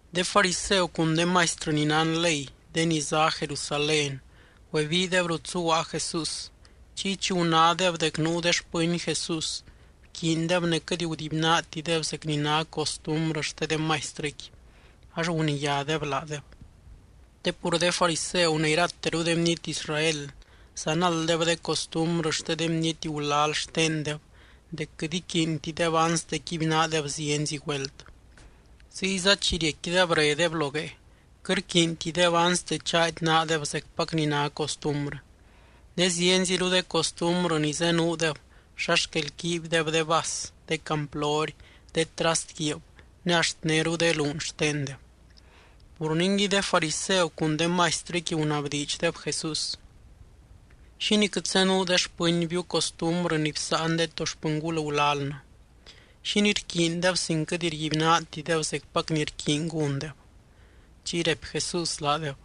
De fariseu cun de maistrɨ ni nán ley de ni zá Jerusalén, güebiideb rut zuguaa Jesús. Chiy chi gunádeb dec nuu de xpɨny Jesús bquiindeb ne quɨt gudibynaatideb zec ni ná costumbrɨ xte de maistrɨqui, ax guniyádeb laadeb. Te pur de fariseu ne irateru de bniety Israel zanalddeb de costumbrɨ xte de bniety gulal xtendeb dec quɨt iquiintideb anste quibynaadeb zienzi güelt. Ziyza chi riecquideb redeb lo guee, quɨt rquiintideb anste chaady naadeb zecpac ni ná costumbrɨ. Ne zienziru de costumbrɨ ni zenuudeb, xa xquel quiibydeb de vas, de camplory, de trast guiib ne axt néru de luun xtendeb. Pur ningui de fariseu cun de maistrɨqui gunabdiidxdeb Jesús: —¿Xínii quɨt zenuu de xpɨnbiu costumbrɨ ni bsáan de to xpɨngul gulalnɨ? ¿Xínii rquiindeb sin quɨt rguibynaatideb zecpac ni rquiiny gúndeb? Chiy raipy Jesús laadeb: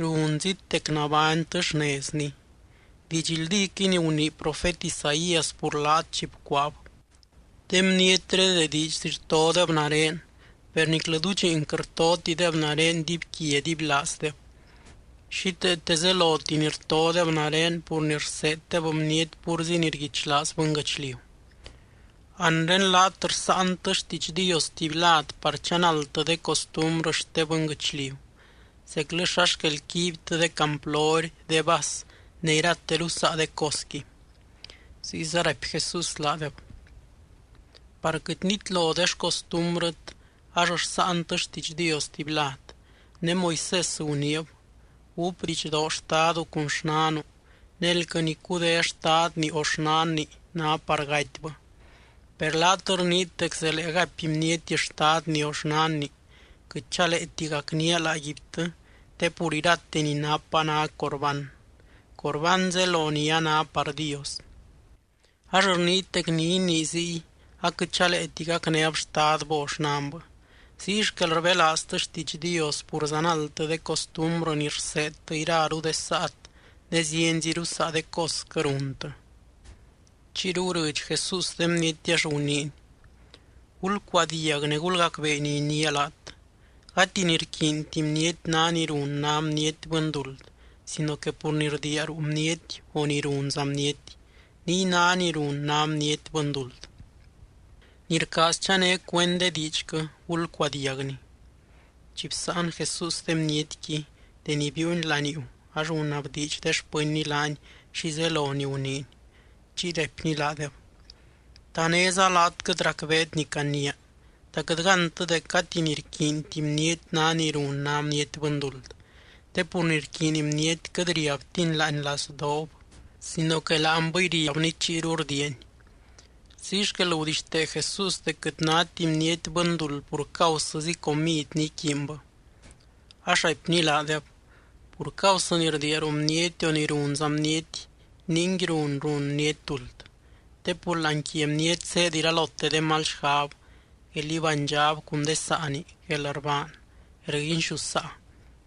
—Runzit dec nabánytɨ xnezni. Didxldíquɨy ni gunii profet Isaías pur laat chi bcuaab: De bnietré de diidxzi rtodeb nare, per niclɨ dudxiin quɨt rtotideb nare dibyquia dibylaazdeb. Xíteete zeloti ni rtodeb nare pur ni rseeddeb bniety púrzi ni rguichlaaz bɨnguɨchliu. Anre laat rsáantɨ xtiidx Dios tuby lad par chanaldtɨ de costumbrɨ xte bɨnguɨchliu, zeclɨ xa xquel quiibytɨ de camplory, de vas ne irateru saa de cosqui. Ziyza raipy Jesús laadeb: —Par quɨt nitlo de xcostumbrɨt ax rsáantɨ xtiidx Dios tuby lad. Ne Moisés guniib: “Gúp didxdoo xtadu cun xnanu”, ne “Elquɨ ni cudé xtadni o xnanni, ná par gatybɨ.” Per laat rniit dec zelee gaipy bniety xtadni o xnanni: “Quɨt chaleeti gacnía laaguibtɨ, te pur irate ni napa ná Corbán” (Corbán zelo ni a ná par Dios). Ax rniit dec ni inii ziy, aquɨt chaleeti gacnéb xtadbɨ o xnanbɨ. Ziy xquel rbelaaztɨ xtiidx Dios pur zanaldtɨ de costumbrɨ ni rseedtɨ iraru de saat ne zienziru saa de cosquɨ runtɨ. Chiyru gurɨdx Jesús de bniety ax guniiny: —Gulcuadiag ne gulgacbee ni iniia laat. Gati ni rquiinti bniety ná ni run ná bniety bɨnduld sino que pur ni rdiia ruu bniety o ni runza bniety, niy ná ni run ná bniety bɨnduld. Ni rcaaz chané cuend de diidxquɨ, gulcuadiagni. Chi bsáan Jesús de bnietqui, deni biiuny laniuu ax gunabdiidx de xpɨnny laany xi zelo ni guniiny. Chiy raipny laadeb: —¿Ta néza laat quɨt racbeet ni caniia? ¿Ta quɨt gántɨ dec gati ni rquiinti bniety ná ni run ná bniety bɨnduld, te pur ni rquiiny bniety quɨt riabtini láani lazdoob sino que láanbɨy riabni chiyru rdiiani? Ziy xquel gudixtee Jesús dec quɨt náti bniety bɨnduld pur causɨzi comid ni iquiinbɨ. Ax raipny laadeb: —Pur causɨ ni rdiia ruu bniety o ni runza bniety ningui run, run bniety duld. Te pur láani quia bniety zéed iralote de mal xgab, guél ibánydxab cun de saani, guelrbaan, guelrguinxusaa,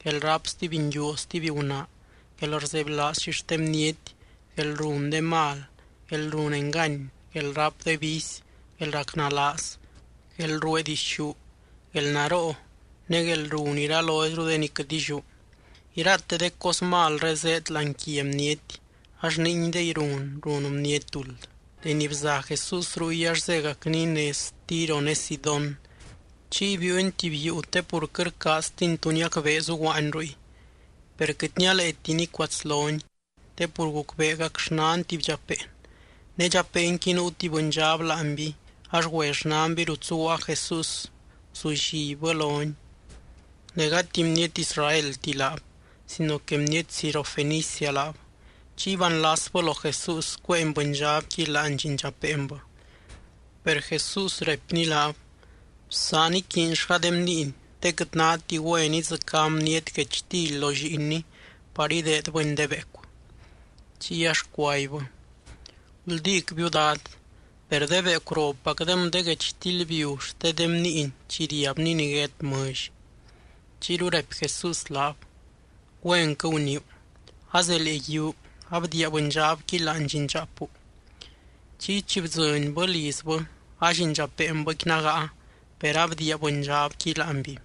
guelráp stuby nguiu o stuby gunaa, guelrzebylaaz xixte bniety, guelrun de mal, guelrun engany, guelráp de vicy, guelracnalaaz, guelruee dixú, guelnaroo, ne guelrun iraloizru de ni quɨt illiú. Irate de cos malré zéed láani quia bniety ax ninguidey run, run bniety duld. Deni bza Jesús ruy ax zégacny nez Tiro ne Sidón, chiy biiuny tuby yuu te pur quɨt rcaaztiny tu niacbee zuguaany ruy. Per quɨt nialeeti nicuatslony. Te pur gucbeegac xnan tuby dxapeen, ne dxapeenqui nuu tuby bɨndxab láanby. Ax güe xnanby rut zuguaa Jesús guzullibbɨ lony. Ne gati bniety Israelti laab sino que bniety Sirofenicia laab. Chiy baanlasbɨ lo Jesús cuéeny bɨndxabqui láani llindxapeenbɨ. Per Jesús raipny laab: —Bsaan iquiinllga de bniiny, te quɨt náti güen idzɨcá bniety guechtily lo lliinni par ideedbɨni de beecu. Chiy ax cuaibbɨ: —Guldícbiu, Dad, per de beecu ropacdem de guechtily biu xte de bniiny chi riabni niguét mɨlly. Chiyru raipy Jesús laab: —Güenquɨ guniiu. Azelee yiuu, abdiia bɨndxabqui láani llindxaapu. Chiy chi bdzɨnbɨ lizbɨ, allindxapeenbɨqui nágaa, per abdiia bɨndxabqui láanby.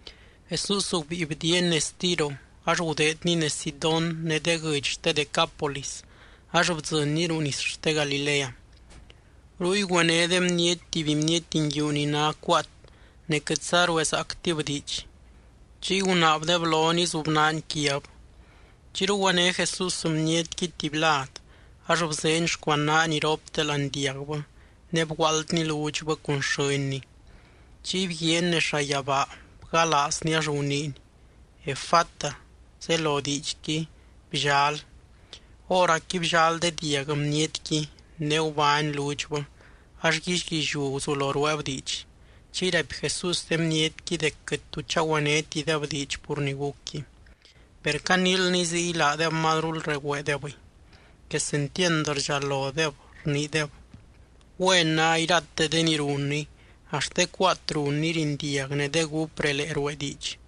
Jesús gubíi bdiiany nez Tiro, ax gudeedny nez Sidón ne de guɨdx xte Decápolis ax bdzɨnny ruu nis xte Galilea. Ruy güené de bniety tuby bniety nguiu ni ná cuaat ne quɨtza ruezaactib diidx, chiy gunaabdeb lony izubnaany quiab. Chiyru güené Jesús bnietqui tuby lad ax bzeeny xcuanaany iropte láani diagbɨ ne bguaaldny ludxbɨ cun xɨ́nny. Chiy bguiaany nez llayabaa bgalaazny ax guniiny: —¡Efata! —zelo diidxqui: ¡Bllal! Hóracqui bllal de diag bnietqui ne gubány ludxbɨ, ax guíllyguilliu guzulo rueeb diidx. Chiy raipy Jesús de bnietqui dec quɨt tu chagüenétideb diidx pur ni gucqui. Per caniilny ziy laadeb mazrul regüeedebɨy. Quesentiand rdxalodeb, rniideb: —Güen ná irate de ni runny, axt de cuaat runny rindiag ne de gúp relee ruee diidx.